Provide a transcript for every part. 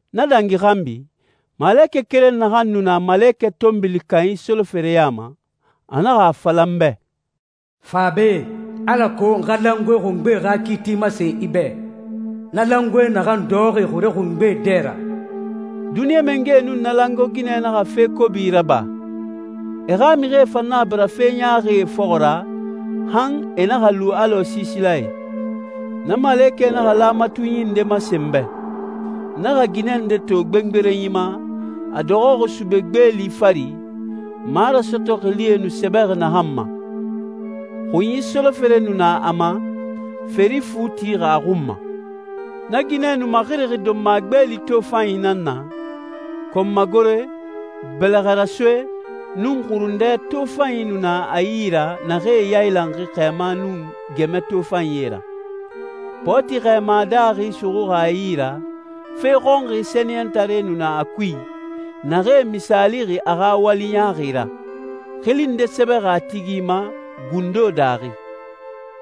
Na dangi xanbi, malekɛ keren naxan nu na na malekɛ tɔnbili kanyi solofere ya ma, a naxa a fala n bɛ, «Fa be, alako n xa langoe xungbe xa kiiti masen i bɛ, na langoe naxan dɔxɔxi xure xungbee dɛ ra.» Duniɲa mangɛe nun na langoe ginɛ naxa fe kobi raba. E xa mixie fan naxa bira fe ɲaaxie fɔxɔ ra han e naxa lu alɔ siisilae. Na malekɛ naxa laamatunyi nde masen n bɛ. N naxa ginɛ nde to gbengberenyi ma, a dɔxɔxi sube gbeeli fari, marasɔtɔ xilie nu sɛbɛxi naxan ma. Xunyi solofere nu na a ma, feri fu tixi a xun ma. Na ginɛ nu maxirixi donma gbeeli tofanyi nan na, kɔnmagore, bɛlɛxɛrasoe, nun xurundɛ tofanyie nu na a yi ra naxee yailanxi xɛɛma nun gɛmɛ tofanyie ra. Pɔɔti xɛɛma daaxi suxuxi a yi ra, fe xɔnxi sɛniyɛntaree nu na a kui, naxee misaalixi a xa wali ɲaaxi ra. Xili nde sɛbɛxi a tigi ma gundo daaxi: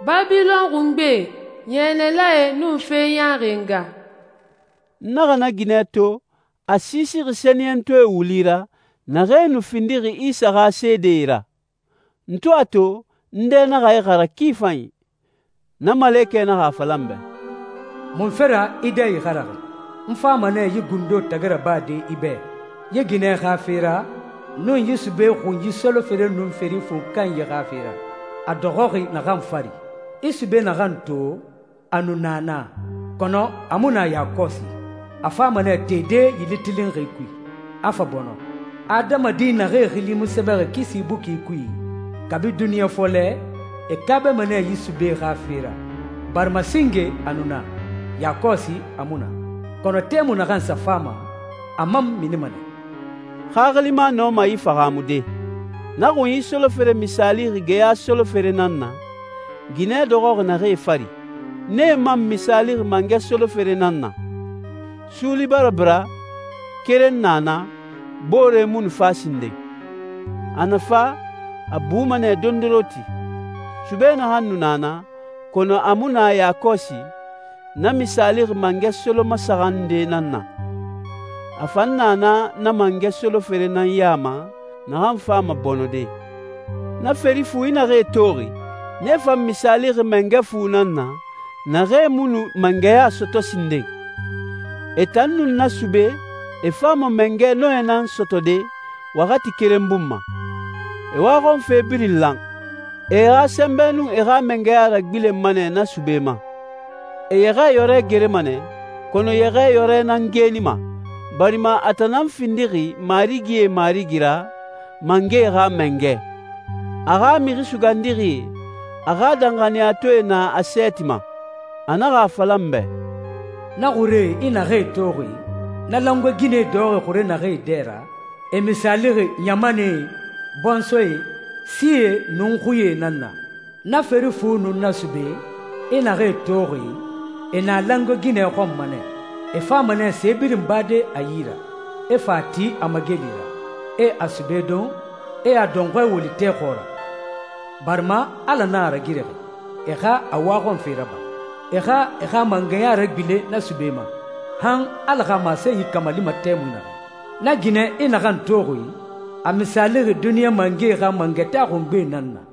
«Babilɔn xungbe, yɛnɛlae nun fe ɲaaxie nga.» N naxa na ginɛ to, a siisixi sɛniyɛntɔɛe wuli ra, naxee nu findixi Isa xa seedee ra. N to a to, n dɛ naxa ixara ki fanyi. Na malekɛ naxa a fala n bɛ, «Munfe ra i dɛ ixaraxi? N fama nɛ yi gundo tagi rabade i bɛ, yi ginɛ xa fe ra nun yi sube xunyi solofere nun feri fu kanyi xa fe ra a dɔxɔxi naxan fari. I sube naxan to, a nu na na, kɔnɔ a mu na yakɔsi. A fama nɛ tede yili tilinxi kui, a fa bɔnɔ. Adamadi naxee xili mu sɛbɛxi kisi buki kui, kabi duniɲa fɔlɛ, e kaabama nɛ yi sube xa fe ra, barima singe a nu na, yakɔsi a mu na, kɔnɔ tɛmui naxan sa fama, a man minima nɛ.» Xaxilima nɔma yi fahaamude: Na xunyi solofere misaalixi geya solofere nan na, ginɛ dɔxɔxi naxee fari. Nee man misaalixi mangɛ solofere nan na. Suuli bara bira, keren na na, boore mu nu fa sinden. A na fa, a buma nɛ dondoronti. Sube naxan nu na na, kɔnɔ a mu na yakɔsi, na misaalixi mangɛ solomasaxan nde nan na. A fan na na na mangɛ solofere nan ya ma naxan fama bɔnɔde. Na feri fu i naxee toxi, nee fan misaalixi mangɛ fu nan na, naxee mu nu mangɛya sɔtɔ sinden. E tan nun na sube, e fama mangɛ nɔɛ nan sɔtɔde waxati keren bun ma. E waxɔnfe birin lan. E e xa sɛnbɛ nun e xa mangɛya ragbilenma nɛ na sube ma. E Yɛxɛɛyɔrɛ gerema nɛ, kɔnɔ Yɛxɛɛyɔrɛ nan geenima, barima a tan nan findixi marigie Marigi ra, mangɛe xa Mangɛ. A xa mixi sugandixie, a xa danxaniyatɔɛe na a sɛɛti ma. A naxa a fala n bɛ, «Na xuree i naxee toxi, na langoe ginɛ dɔxɔxi xure naxee dɛ ra, e misaalixi ɲamanɛe, bɔnsɔɛe, sie, nun xuie nan na. Na feri fu nun na sube, i naxee toxi, e na langoe ginɛ xɔnma nɛ. E fama nɛ se birin bade a yi ra, e fa a ti a mageli ra, e a sube don, e a dɔnxɔɛ woli tɛ xɔɔra, barima Ala nan a ragirixi e xa a waxɔnfe raba. E xa e xa mangɛya ragbilen na sube ma, han Ala xa masenyi kamalima tɛmui naxɛ. Na ginɛ i naxan toxi, a misaalixi duniɲa mangɛe xa mangataa xungbe nan na.»